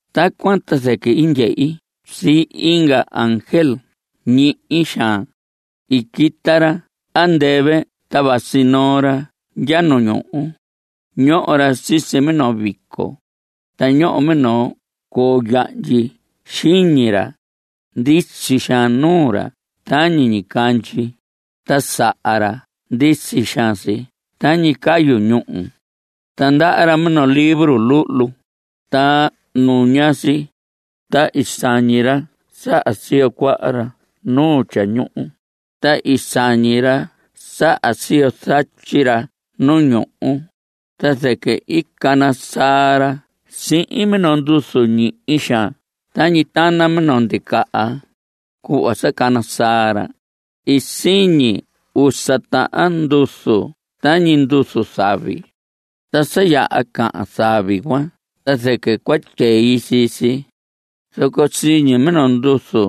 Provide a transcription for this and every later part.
Tacuan ta zɨquɨ i ndyehi sii inga ángel ñihi xaan. I quita ra andɨvɨ ta vasi noo ra ndya nu ñuhu. Ñoho ra sisi minoo vico, ta ñoho minoo coo yahndyi xiñi ra. Ndisi xaan nuu ra tañi ñicandyi, ta saha ra ndisi xaan si tañi cayu ñúhu. Ta ndaha ra minoo libro luhlu, ta nuña si. Ta i sañi ra saha siyo cuaha ra nu tyañuhu, ta i sañi ra saha siyo zatyi ra nu ñuhu. Ta zɨquɨ i cana saa ra sihin minoo nduzu ñihi xaan tañi tana minoo ndicaha. Cuhva sa cana saa ra, i siñi usa tahan nduzu tañi nduzu zavi. Ta sa yaha cahan zavi cuan ta zɨquɨ cua tyei sii si, zoco siñi mino nduzu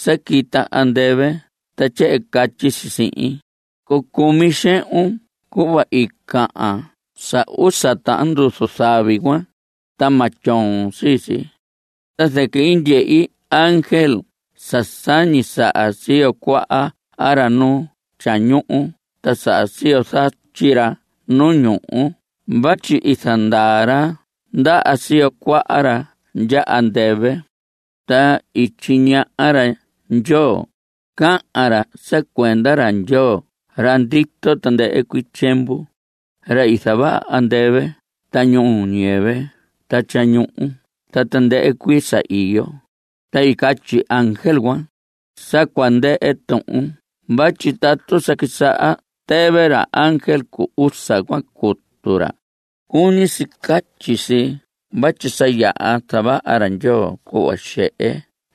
sa quita andɨvɨ ta tyehen catyi si sihin: Cucumi xehun cuhva i cahan sa usa tahan nduzu zavi cuan, ta ma tyoon sii si. Ta zɨquɨ i ndyehi ángel sa sañi saha siyo cuaha ra nu tyañuhu ta saha siyo zatyi ra nu ñuhu vatyi i zandaa ra ndaha siyo cuaha ra ndya andɨvɨ. Ta i tyiñaha ra Ndyoo. Cahan ra sa cuenda ra Ndyoo ra ndito tandɨhɨ cuii tyiemvu, ra i zavaha andɨvɨ ta ñuhu ñuu ñiyɨvɨ ta tyañuhu ta tandɨhɨ cuii sa iyo. Ta i catyi ángel cuan: Sa cua ndɨhɨ tuhun vatyi tatu sa quisaha tɨvɨ ra ángel cu usa cuan cutu ra, cuñi si catyi si vatyi sa yaha zavaha ra Ndyoo cuhva xehe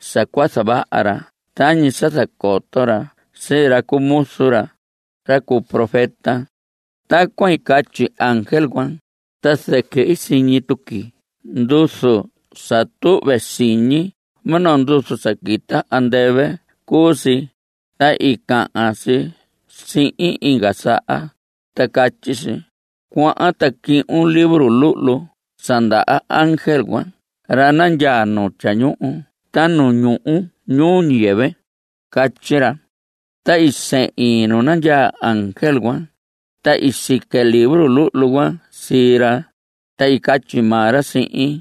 sa cua zavaha ra tañi sa zacoto ra sii ra cu muzu ra, ra cu profeta. Tacuan i catyi ángel cuan, ta zɨquɨ i siñi tuqui nduzu sa tuhve siñi. Minoo nduzu sa quita andɨvɨ cuu si, ta i cahan si sihin inga saha, ta catyi si: Cuahan ta cuhun libro luhlu sa ndaha ángel ra nandyaa nu tyañuhu ta nu ñuhu ñuu ñiyɨvɨ. Catyi ra. Ta i sehin nu nandyaa ángel cuan, ta i sique libro luhlu cuan sii ra, ta i catyi maa ra sihin: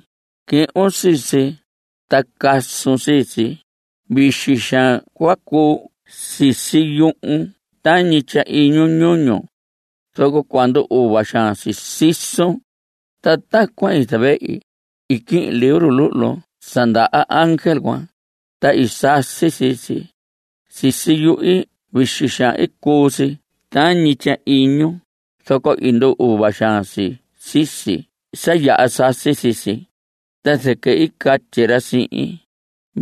Cuhun sii si, ta casun sii si. Vixi xaan cua cuu si sisi yuhun tañi tyahiñu ñuñu. Zoco cua ndu‑uva xaan si sisun. Ta tacuan i zavehi. I quihin libro luhlu sa ndaha ángel cuan, ta i sasi sii si. Sisi yuhi vixi xaan i cuu si tañi tyahiñu, zoco i ndu‑uva xaan si sisi sa yaha sasi sii si. Ta zɨquɨ i catyi ra sihin: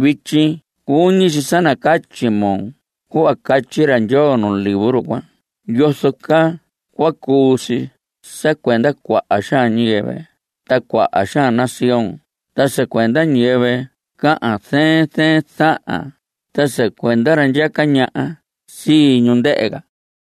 Vityi cuñi si sa nacatyi moo cuhva catyi ra Ndyoo nu libro cuan yozo caa cua cuu si sa cuenda cuaha xaan ñiyɨvɨ ta cuaha xaan nación ta sa cuenda ñiyɨvɨ cahan zɨɨn zɨɨn zahan ta sa cuenda ra ndyaca ñaha sii ñu, ndɨhɨ ca.